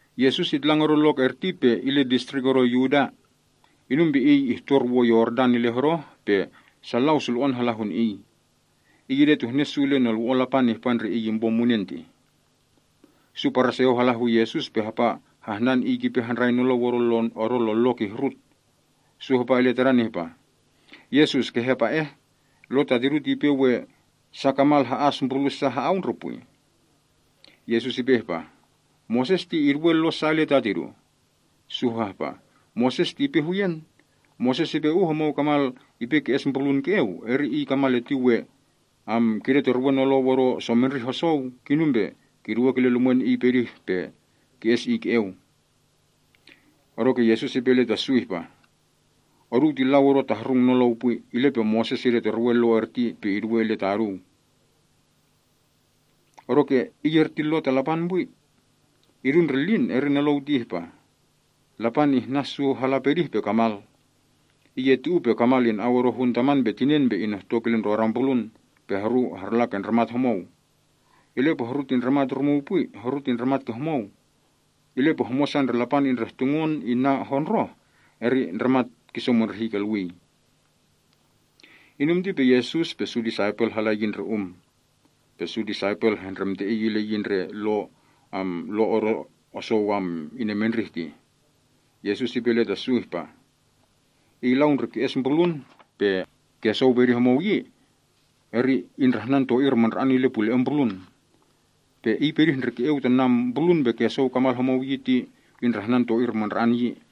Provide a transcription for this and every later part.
Yesus itlang odo lok erti pe ile distrik odo Yudea. Inum pe Iy ihtor wo Yordan ile hodoh, pe sa lau sulo‑on hala hun Iy. Iy idetuhne su ile nolwo‑on Lapan ihpa ndre Iy impo munen tih. Su Paraseo hala hu Yesus pe hapa hahnan Iy kipe handrai nolou odo lon lo kihrut. Su hapa ile Tadan ihpah, “Yesus, kehe apa eh. Lo ta tidu ti ipe we sa kamal ha‑as mbrulu’ sa ha‑au ndre pwi?” Yesus ipe ihpah, “Moses ti iduwe Lo sa ile taduu?” Su hapa ihpah, “Moses ti ipe huyen. Moses ipe uh homou kamal ipe ki‑es mbrulun ke‑eu, eri iy kamal erti we kidetorwe nolou odo somendrih osou, kinum pe kiduwe kile lumwen iy pedih ti pe ki‑es iy ke‑eu.” Odoke Yesus ipe ile ta su ihpa, “Oduu ti lau odo tahrung nolou pwi, ile pe Moses idetorwe Lo erti pe iduwei ile ta oduu. Odoke iy erti Lo ta Lapan pwi. Idu ndre lin eri nolou ti ihpa, ‘Lapan ihnan su hala pedih pe kamal.’ ‘Iy eti uu pe kamal ina‑au odo hun taman pe tinen pe inohtok ile ndrodan mbrulun, pe horu harla ke ndramat homou.’ Ile pe horu ti ndramat rumuu pwi. Horu ti ndramat ke homou. Ile pe homosa ndre Lapan indrehtungon inna hondroh, eri ndramat kisomondrihi kolwii.” Inum ti pe Yesus pe su disaipel hala yi ndre um. Pe su disaipel hehndremte Iy ile yi ndre Lo odo osou inemendrih tih. Yesus ipe ile ta su ihpah, “Iy lau ndre ki‑es mbrulun pe kesou pedih homou yi ti indrahnan to‑ir mandra‑an ile pule‑en mbrulun. Pe iy pedih ndre ke‑eu ta mbrulun pe kesou kamal homou yi ti indrahnan to‑ir mandra‑an yi.”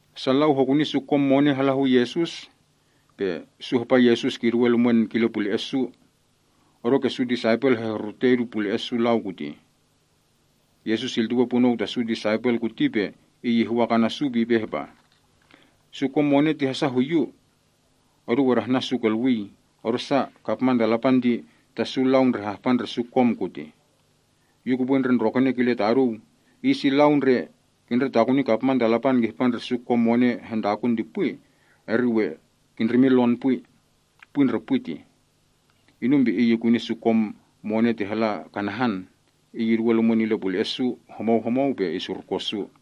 Sa lau hokuni su kom mone hala hu Yesus. Su hapa Yesus kiduwe lumwen kile pule‑e’ su. Odoke su disaipel hehrurute idu pule‑e’ sa lau kutih. Yesus iltuwei punou ta su disaipel kuti, pe Iy ihwak ana’ su pe ipe ihpah, “Su kom mone ti hasa hu Yu. Oduu adahnan su kolwii, odosa kapman ta Lapan ti ta su lau ndre hahpa ndre su kom kutih. Yu kupwe ndre ndrokene kile ta oduu, iy si lau ndre kindretakuni kapman ta Lapan kihpa ndre su kom mone hentakun ti pwi, eri we kindrimin lon pwi. Pwi ndre pwi tih.” Inum pe Iy ikuni su kom mone ti hala kanahan. Iy iduwe lumwen ile pule‑e’ su homou homou pe isurkon su.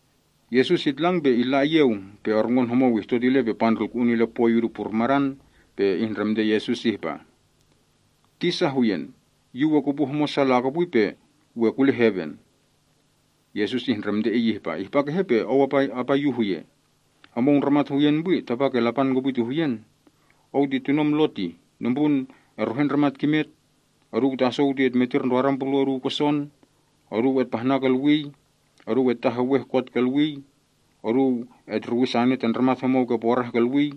Yesus itlang pe illa iyeu, pe orngon homou ihtot ile pe pandrulku‑un ile poi idu purmadan, pe ihndremte Yesus ihpah, “Tisa huyen, yu we kupu homosa lakopwi pe we kule heven?” Yesus ihndremte iy ihpah, “Ihpa kehe pe ou apa Yu huye? Homou ndramat huyen pwi, tapake Lapan kopwi ti huyen. Ou ti tunom Lo tih: ‘Nombrun etruhe ndramat kimet. Oduu tasou ti etmetir ndrodan mbrulu’ oduu koson. Oduu etpahna kolwii. Oduu etaheweh kot kolwii. Oduu etruwi sane ta ndramat homou ke porah kolwii.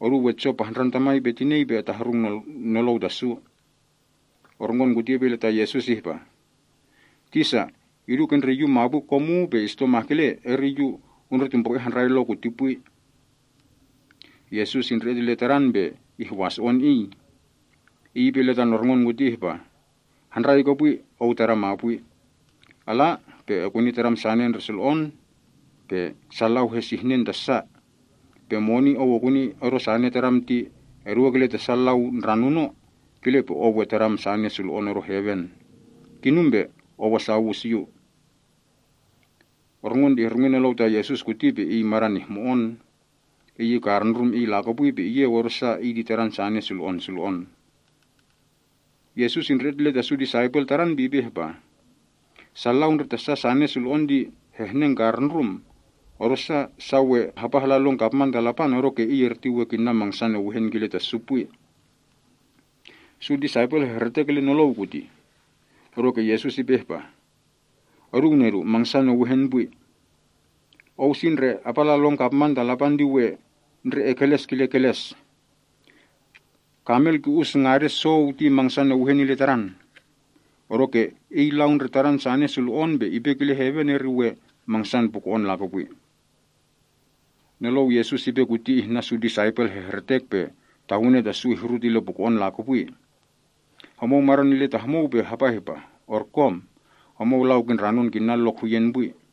Oduu etso pahndran tamai pe tinei pe etahrung nolou ta su.’” Orngon kuti ipe ile ta Yesus ihpah, “Tisa, idu ke ndre yu mapwi kom uu pe isito mahkele, eri yu undretumbru‑e handrai Lo kiti pwi.” Yesus indre‑et ile tadan pe ihwaso‑on iy. Iy ipe ile tan orngon kuti ihpah, “Handrai kopwi yi ou tadam mapwi. Ala pe ekuni tadam sane ndre sulo‑on pe sa lau hesihnen ta sa. Pe moni ou okuni odo sane tadam ti eduwe kile ta sa lau ndranuno, kile pe ou we tadam sane sulo‑on odo heven. Kinum pe ou asa owus Yu.” Orngon ti ihrungi nolou ta Yesus kuti pe iy madan ihmo‑on. Iy ikarundrum iy lakopwi pe iyeu, odosa iy ti tadan sane sulo‑on sulo‑on. Yesus indre‑et ile ta su disaipel Tadan pe ipe ihpa, “Sa lau ndre ta sa sane sulo‑on ti hehnengkarundrum, odosa su we hapa hala lon kapman ta Lapan odoke iy erti we kinna mangsan ewehen kile ta su pwi.” Su disaipel hehretek ile nolou kutih. Odoke Yesus ipe yi ihpah, “Oduu nedu, mangsan ewehen pwi. Ou si ndre apa ala lon kapman ta Lapan ti we ndre ekeles kile keles. Kamel we ki‑us lon ngaden sou ti mangsan ewehen ile tadan. Odoke ke iy lau ndre tadan sane sulo‑on pe ipe kile heven eri we mangsan puko‑on lakopwi.” Nolou Yesus ipe kuti ihnan su disaipel hehretek pe tawene ta su ihrut ile puko‑on lakopwi. Homou madan ile ta homou pe hapa ihpa, “Orkom! Homou lau kindranon kinna lok huyen pwi.”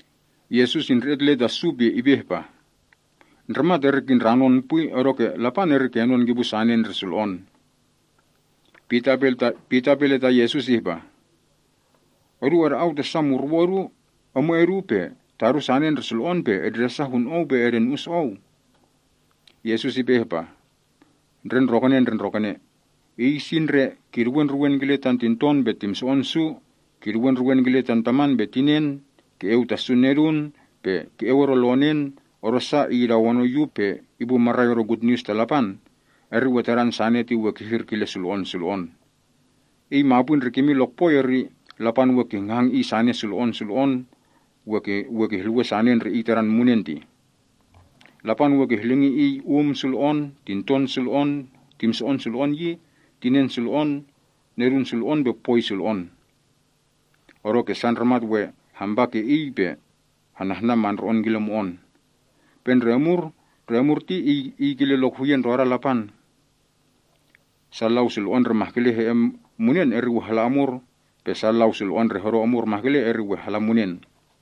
Yesus indre‑et ile ta su pe ipe ihpah, “Ndramat eri indranon pwi, odoke Lapan eri kenon kipu sane ndre sulo‑on.” Pita ipe ile ta Yesus ihpah, “Odu ada‑au ta sa murwo’ odu, emwe’ odu, pe tadu sane ndre sulo‑on pe etndresa hun Ou, pe edenu‑us Ou.” Yesus ipe ihpah, “Ndre ndrokene ndre ndrokene. Iy si ndre kiduwe ndruwen kile tan tinton pe timso‑on su, kiduwe ndruwen kile tan taman pe tinen, ke‑eu ta su nedun, pe ke‑eu odo lonen, odosa iy idawonon Yu pe ipu marai odo Gutnius ta Lapan, eri tadan sane ti we hehir kile sulo‑on sulo‑on. Iy mapwi ndre kimin lokpoi eri Lapan we kihngahang iy sane sulo‑on sulo‑on, we kihluwen sane ndre iy tadan munen tih. Lapan we kihlingi iy um sulo‑on, tinton sulo‑on, timso‑on sulo‑on, tinen sulo‑on, nedun sulo‑on pe poi sulo‑on. (Odoke sa ndramat we hampa ke iy pe henahnan mandro‑on killa mo‑on.) Pe ndre omur ti iy we kile lok huyen ndroda Lapan. Sa lau sulo‑on ndre mahkele he‑en munen eri we hala omur, pe sa lau sulo‑on ndre hodo omur mahkele, eri we hala munen.”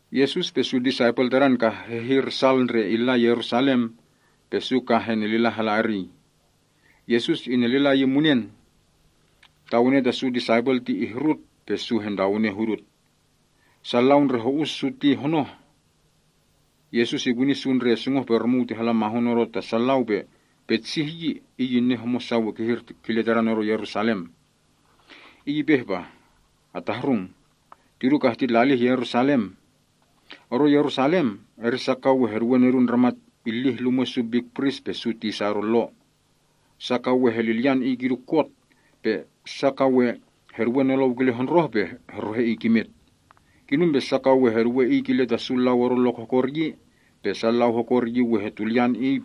Yesus pe su disaipel tadan kah hehir sal ndre illa Yerusalem, pe su kah henelila hala eriy. Yesus inelila iyin munen. Tawene ta su disaipel ti ihrut pe su hentawene hudut. Sa lau ndre ho‑us su ti honoh. Yesus ikuni su ndre sungoh‑pe‑rumuu ti hala mahun odo ta sa lau, pe petsih yi Iy inen homosa ka we kihir kile tadan odo Yerusalem. Iy ipe ihpah, “Atahrung. Tidu kah titlalih Yerusalem. Odo Yerusalem, eri sa ka we heduwe Nedun Ndramat ilih lumwe’ su pris mandra‑ane pe su tisa odo Lo. Sa ka we helilyan Iy kidu kot, pe sa ka we heduwe nolou kile hondroh pe heruhe Iy kimet. Kinum pe sa ka we heduwe Iy kile ta sa lau odo lok hokor yi, pe sa lau hokor yi we hetulyan Iy,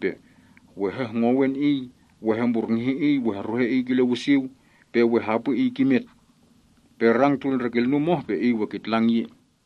we hehngowen Iy, we hemburnguhi Iy, we heruhe Iy kile wisiu, pe we hapwi Iy kimet. Pe rang tul ndre kilnum oh pe Iy we kitlang yi.”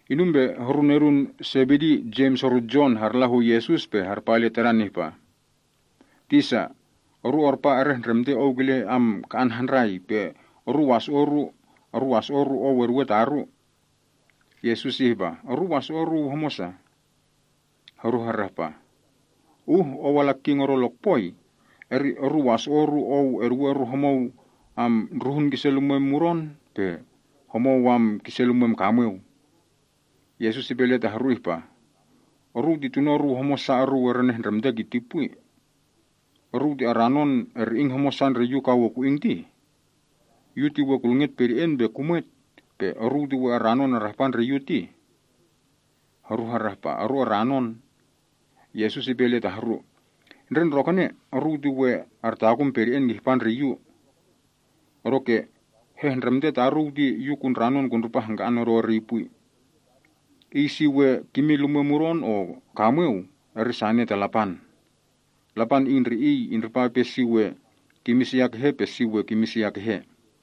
Inum pe horu nedun Sebedi, Jems horu Jon, harla hu Yesus pe harpa ile Tadan ihpah, “Tisa, oru arpa erehndremte Ou kile ka‑an handrai, pe oru waso‑o’ oru Ou eduwe taru.” Yesus ihpa, “Oruu waso‑o’ oruu homosa?” Horu harahpah, “Uh Ou ala King odo lokpoi, eri oru waso‑o’ oru Ou eduwe oru homou ndruhun kise lumwem mudon pe homou kise lumwem kamweu.” Yesus ipe ile ta horu ihpah, “Oruu ti tuno’ oruu homosa oruu erenehndremte kiti pwi. Oruu ti aranon eri‑ing homosa ndre Yu ka we ku‑ing tih? Yu ti we kulnget pede‑en pe kumwet, pe oruu ti we aranon arahpa ndre Yu tih?” Horu harahpa, “Oru aranon.” Yesus ipe ile ta horu, “Ndre ndrokene, oruu ti we artakun pede‑en kihpa ndre Yu. Odoke hehndremte taruu ti Yu kundranon kundripa hangka‑an odo eriy pwi. Iy si we kimin lumwe mudon o kamweu ti sane ta Lapan. Lapan Iy ndre Iy indripa ipe si we kimin sia kehe pe si we kimin sia kehe.”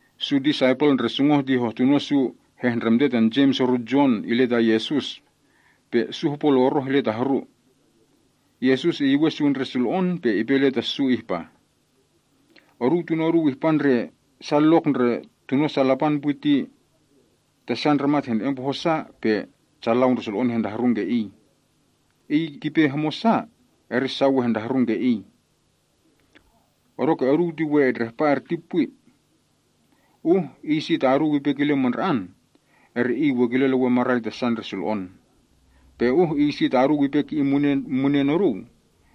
Su disaipel ndre sungoh ti hohtuno su ndremte tan Jems horu Jon ile ta Yesus, pe su hopo loroh ile ta horu. Yesus iyuwen su ndre sulo‑on pe ipe ile ta su ihpah, “Oduu tuno’ oduu ihpa ndre sa lok ndre tuno’ sa Lapan pwi ti ta sa ndramat hene‑en poho’ sa, pe sa lau ndre sulo‑on hentahrung ke iy. Iy kipe sa hopo homosa, eri sa we hehrung ke iy. Odoke oduu ti we etndrahpa erti pwi. Uh iy si ta oduu ipe kile mandra‑an, eri iy we kile lewen marai ta sa ndre sulo‑on. Pe uh iy si ta oduu ipe ki‑in mune’ oduu,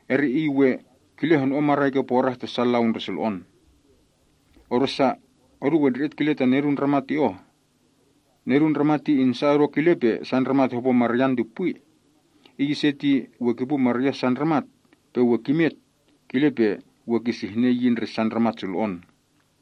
eri iy we kile hono‑on marai ke porah ta sa lau ndre sulo‑on. Odosa, oduu etndre‑et kile tan Nedun Ndramat ti oh. Nedun Ndramat ti insa odo kile pe sa ndramat hopo maryan ti pwi. Iy ise ti we kipu marya’ sa ndramat, pe we kimet, kile pe we kisihnen yi ndre sa sulo‑on.”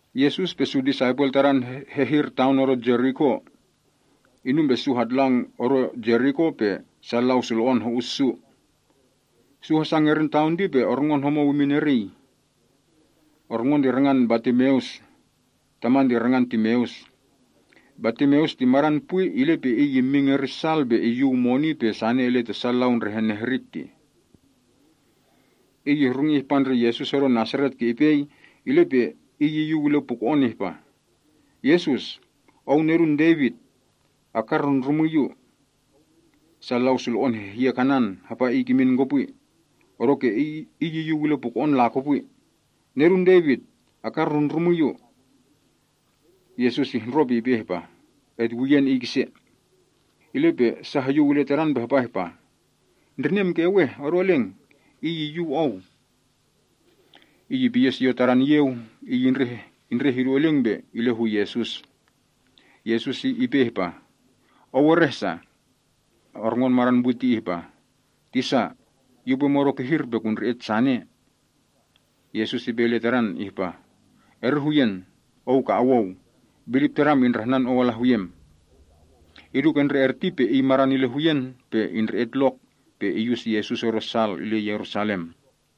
Yesus pe su disaipel Tadan hehir taon odo Jeriko. Inum pe su hatlang odo Jeriko, pe sa lau sulo‑on ho‑us su. Su hasa ngerin taon ti pe orngon homou imin eriy. Orngon ti rangan Bartimeus. (Taman ti rangan Timeus.) Bartimeus ti madan pwi, ile pe iy immin ngerin sal pe iyuw moni pe sane ile ta sa lau ndre henehrik tih. Iy ihrungi ihpa ndre Yesus odo Nasaret ke ipei, ile pe iy iyuw ile puko‑on ihpah, “Yesus, Ou Nedun Devit, akarndrundrumwi yu.” Sa lau sulo‑on hehyek anan, hapa iy kimin kopwi. Odoke iy iyuw ile puko‑on lakopwi, “Nedun Devit, akarndrundrumwi yu!” Yesus ihndro pe ipe ihpah, “Etyuwen iy kise.” Ile pe sa hoyuw ile tadan pe hapa ihpah, “Ndrinem keweh. Odo eleng. Iy iyyuw ou.” Iy ipiyen siot elwe‑en tadan iyeu, iy indreh idu eleng pe ile hu Yesus. Yesus ipe ihpah, “Ou ereh sa?” Orngon madan pwi ti ihpah, “Tisa, yu upwe modo kihir pe kundre‑et sane.” Yesus ipe ile tadan ihpah, “Eri huyen, ou ka owou. Bilip tadam indrahnan ou ala huyem.” Idu ke ndre erti pe iy madan ile huyen pe indre‑et lok, pe iyus Yesus odo sal ile Yerusalem.